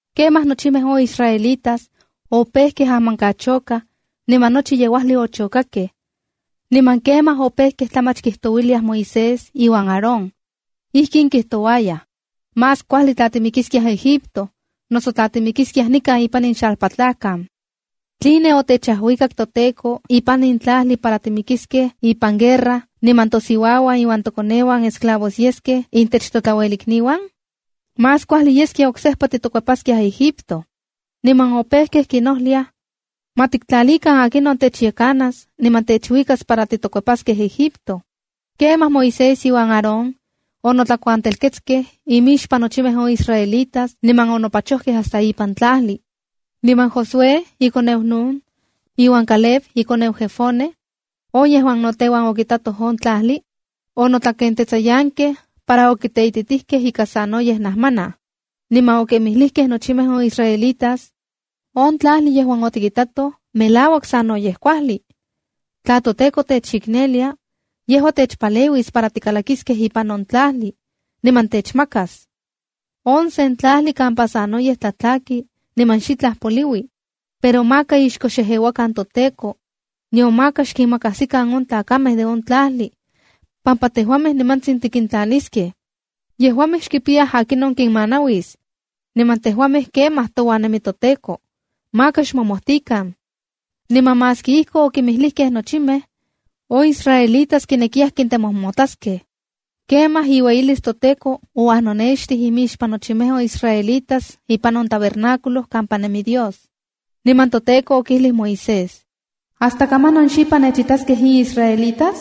Kemaj nochimej on israelitas opejkej ajmankachokaj, niman nochi yeuajli ochokakej. Niman kemaj opejkej tlamach kijtouiliaj Moisés iuan Aarón. Ijkin kijtouayaj: “¡Más kuajli tla timikiskiaj Egipto, noso tla timikiskiaj nikan ipan in xalpatlajkan! ¿Tline otechajuikak toTEKO ipan in tlajli para timikiskej ipan guerra, niman tosiuauan iuan tokoneuan esclavos yeskej intech totlauelikniuan? Más kuajli yeskia oksejpa titokuepaskiaj Egipto.” Niman opejkej kinojliaj: “¡Ma tiktlalikan akinon techyekanas niman techuikas para titokuepaskej Egipto!” Kemaj Moisés iuan Aarón onotlakuantelketskej imixpan nochimej on israelitas niman onopachojkej hasta ipan tlajli. Niman Josué ikoneu Nun, iuan Caleb ikoneu Jefone, on yejuan no teuan okitatoj on tlajli, onotlakentetsayankej para okiteititijkej ika sanoyej najmanaj, niman okinmijlijkej nochimej on israelitas: —¡On tlajli yejuan otikitatoj melauak sanoyej kuajli! Tla toTEKO techiknelia, yejua techpaleuis para tikalakiskej ipan on tlajli niman techmakas. On sen tlajli kampa sanoyej tlatlaki niman xitlaj poliui. Pero maka ixko xejeuakan toTEKO, nion maka xkinmakajsikan on tlakamej de on tlajli, pampa tejuamej nimantsin tikintlaniskej. Yejuamej xkipiyaj akinon kinmanauis, niman tejuamej kemaj touan nemi toTEKO. ¡Maka xmomojtikan! Niman maski ijkon okinmijlijkej nochimej, on israelitas kinekiyaj kintemojmotlaskej. Kemaj iueyilis toTEKO ouajnonextij imixpan nochimej on israelitas ipan on tabernáculo kampa nemi Dios. Niman toTEKO okijlij Moisés: —¿Hasta kamanon xipan nechitaskej in israelitas?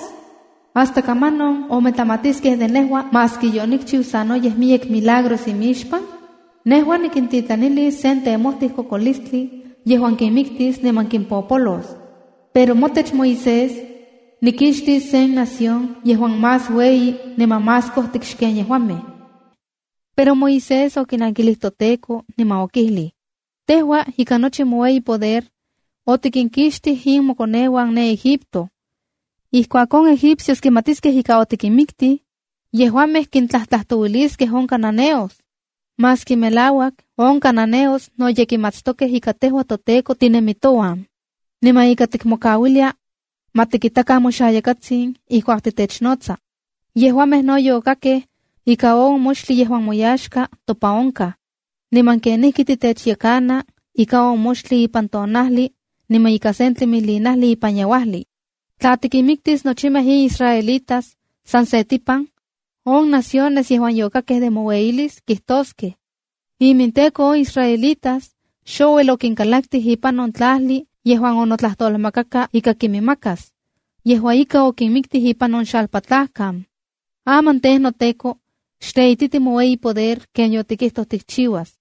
¿Hasta kamanon ometlamatiskej de nejua, maski yonikchiu sanoyej miyek milagros imixpan? Nejua nikintitlanilis sen temojtij kokolistli yejuan kinmiktis niman nikimpopolos. Pero motech Moisés, nikixtis sen nación yejuan más ueyi niman más kojtik xken yejuamej. Pero Moisés okinankilij toTEKO niman okijlij: p —Tejua ika nochi moueyi poder, otikinkixtij in mokoneuan ne Egipto. Ijkuak on egipcios kimatiskej ika otikinmiktij, yejuamej kintlajtlajtouiliskej on cananeos. Maski melauak on cananeos no ye kimatstokej ika tejua toTEKO tinemi touan, niman ika tikmokauilia ma tikitakan moxayakatsin ijkuak titechnotsa. Yejuamej no yokakkej ika on moxtli yejuan moyaxka topan onkaj, niman kenijki titechyekana ika on moxtli ipan tonajli niman ika sen tlimilinajli ipan yeuajli. Tla tikinmiktis nochimej in israelitas san se tipan, on naciones yejuan yokakkej de moueyilis kijtoskej: “IminTEKO on israelitas xouel okinkalaktij ipan on tlajli yejuan onotlajtolmakaka ika kiminmakas. Yejua ika, okinmiktij ipan on xalpatlajkan.” Aman tej, noTEKO xteititi moueyi poder, ken yotikijtoj tikchiuas.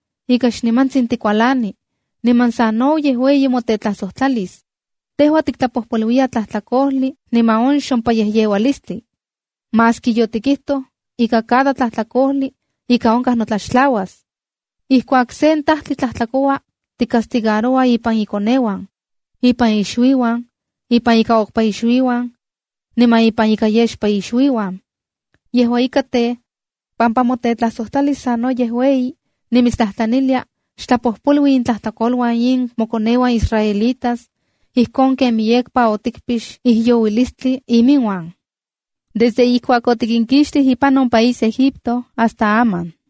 xnimantsin tikualani, niman sanoyej ueyi motetlajsojtlalis. Tejua tiktlapojpoluiya tlajtlakojli niman on xompayejyeualistli, maski yotikijtoj ika cada tlajtlakojli ika onkaj notlaxtlauas. Ijkuak sen tajtli tlajtlakoua, ticastigaroua ipan ikoneuan, ipan ixuiuan, ipan ika okpa ixuiuan, niman ipan ika yexpa ixuiuan. Yejua ika tej, pampa motetlajsojtlalis sanoyej ueyi, nimitstlajtlanilia, xtlapojpolui intlajtlakoluan in mokoneuan israelitas ijkon ken miyekpa otikpix ijyouilistli iminuan, desde ijkuak otikinkixtij ipan on país Egipto hasta aman.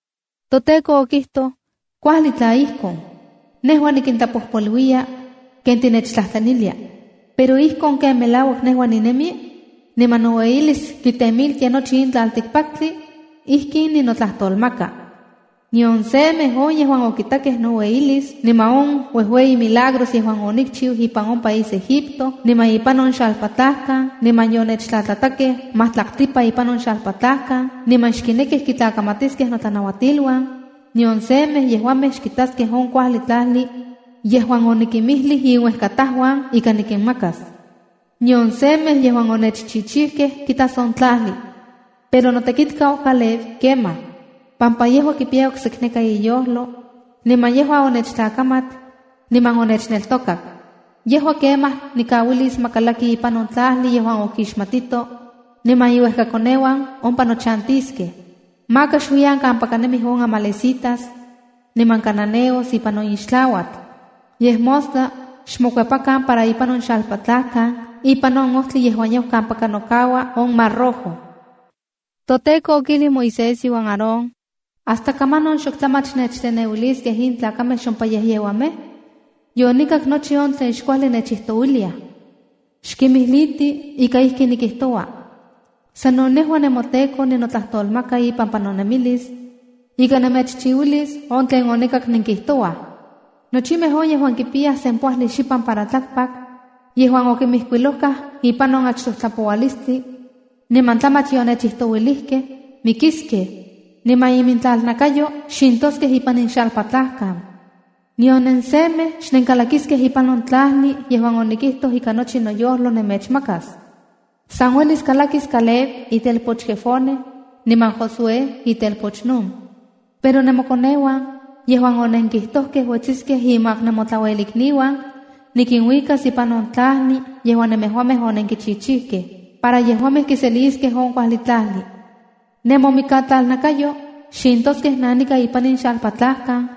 ToTEKO okijtoj: —Kuajli tla ijkon, nejua nikintlapojpoluiya ken tinechtlajtlanilia. Pero ijkon ken melauak nejua ninemi, niman noueyilis kitemiltia nochi in tlaltikpaktli, ijkin ninotlajtolmaka: Nion semej on yejuan okitakej noueyilis, niman on uejueyi milagros yejuan onikchiu ipan on país Egipto, niman ipan on xalpatlajkan, niman yonechtlatlatakej majtlaktlipa ipan on xalpatlajkan, niman xkinekij kitlakamatiskej notlanauatiluan, nion semej yejuamej xkitaskej on kuajli tlajli yejuan onikimijlij inuejkatajuan ika nikinmakas. Nion semej yejuan onechchichijkej kitas on tlajli. Pero notekitkau Caleb, kemaj, pampa yejua kipiya oksekneka iyojlo niman yejua onechtlakamat niman onechneltokak. Yejua kemaj nikauilis ma kalaki ipan on tlajli yejuan okixmatito, niman iuejkakoneuan ompa nochantiskej. Maka xuiyan kampaka nemij on amalecitas niman cananeos ipan on ixtlauatl. Yej mostla xmokuepakan para ipan on xalpatlajkan, ipan on ojtli yejuan yau kampaka nokaua on mar Rojo. ToTEKO okijlij Moisés iuan Aarón: p —¿Hasta kamanon xok tlamach nechteneuiliskej in tlakamej xompayejyeuamej? Yonikak nochi on tlen xkuajli nechijtouiliaj. Xkimijliti ika ijkin nikijtoua: “Sano nejua, nemoTEKO ninotlajtolmaka ipampa nonemilis, ika nemechchiuilis on tlen onikak nenkijtouaj. Nochimej on yejuan kipiyayaj sempoajli xipan para tlakpak, yejuan okinmijkuilojkaj ipan on achtoj tlapoualistli, niman tlamach yonechijtouilijkej, mikiskej, niman iminmikatlalnakayo xintoskej ipan in xalpatlajkan. Nion nensemej xnenkalakiskej ipan on tlajli yejuan onikijtoj ika nochi noyojlo nemechmakas. San uelis kalakis Caleb, itelpoch Jefone, niman Josué, itelpoch Nun. Pero nemokoneuan yejuan onenkijtojkej uetsiskej inmak nemotlauelikniuan, nikinuikas ipan on tlajli yejuan nemejuamej onenkichichijkej, para yejuamej kiseliskej on kuajli tlajli. Nemomikatlalnakayo xintoskej nanika ipan in xalpatlajkan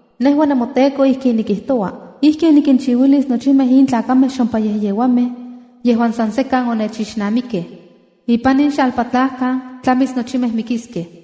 Nejua nemoTEKO ijkin nikijtoua: Ijkin nikinchiuilis nochimej in tlakamej xompayejyeuamej yejuan san sekan onechixnamikkej. Ipan in xalpatlajkan tlamis nochimej mikiskej.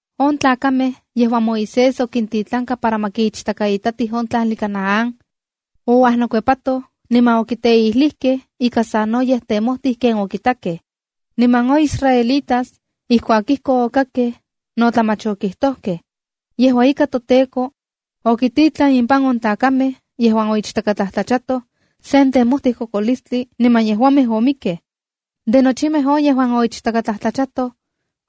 On tlakamej yejuan Moisés okintitlanka para ma kiichtakaitatij on tlajli Canaán, ouajnokuepatoj niman okiteijlijkej ika sanoyej temojtij ken okitakej. Niman on israelitas, ijkuak ijkon okakkej, no tlamach okijtojkej. Yejua ika, toTEKO okititlan impan on tlakamej yejuan oichtakatlajtlachatoj sen temojtij kokolistli niman yejuamej omikkej. De nochimej on yejuan oichtakatlajtlachatoj,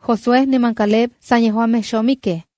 Josué niman Caleb san yejuamej xomikej.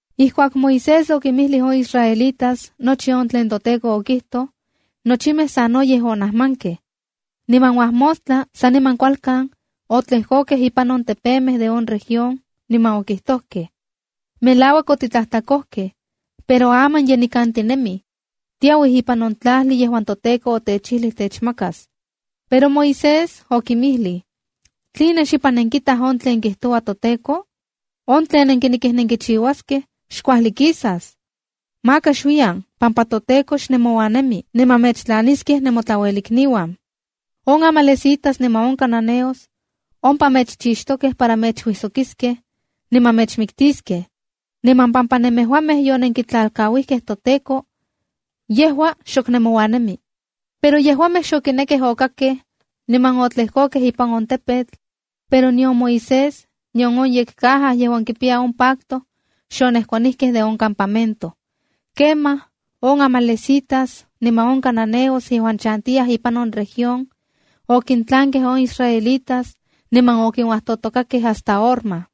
Ijkuak Moisés okinmijlij on israelitas nochi on tlen toTEKO okijtoj, nochimej sanoyej onajmankej. Niman uajmostla saniman kualkan, otlejkokej ipan on tepemej de on región, niman okijtojkej: —Melauak otitlajtlakojkej, pero aman ye nikan tinemij. Tiauij ipan on tlajli yejuan toTEKO otechijlij techmakas. Pero Moisés okinmijlij: p —¿Tline xipan nenkitaj on tlen kijtoua toTEKO? ¡On tlen nenkinekij nenkichiuaskej xkuajli kisas! Maka xuiyan, pampa toTEKO xnemouan nemi, niman mechtlaniskej nemotlauelikniuan. On amalecitas niman on cananeos ompa mechchixtokej para mechuijsokiskej, niman mechmiktiskej. Niman pampa nemejuamej yonenkitlalkauijkej toTEKO, yejua xok nemouan nemi. Pero yejuamej xokinekej okakkej niman otlejkokej ipan on tepetl, pero nion Moisés, nion on yekcaja yejuan kipiya on pacto xonejkuanijkej de on campamento. Kemaj on amalecitas niman on cananeos yejuan chantiyaj ipan on región, okintlankej on israelitas niman okinuajtojtokakej hasta Horma.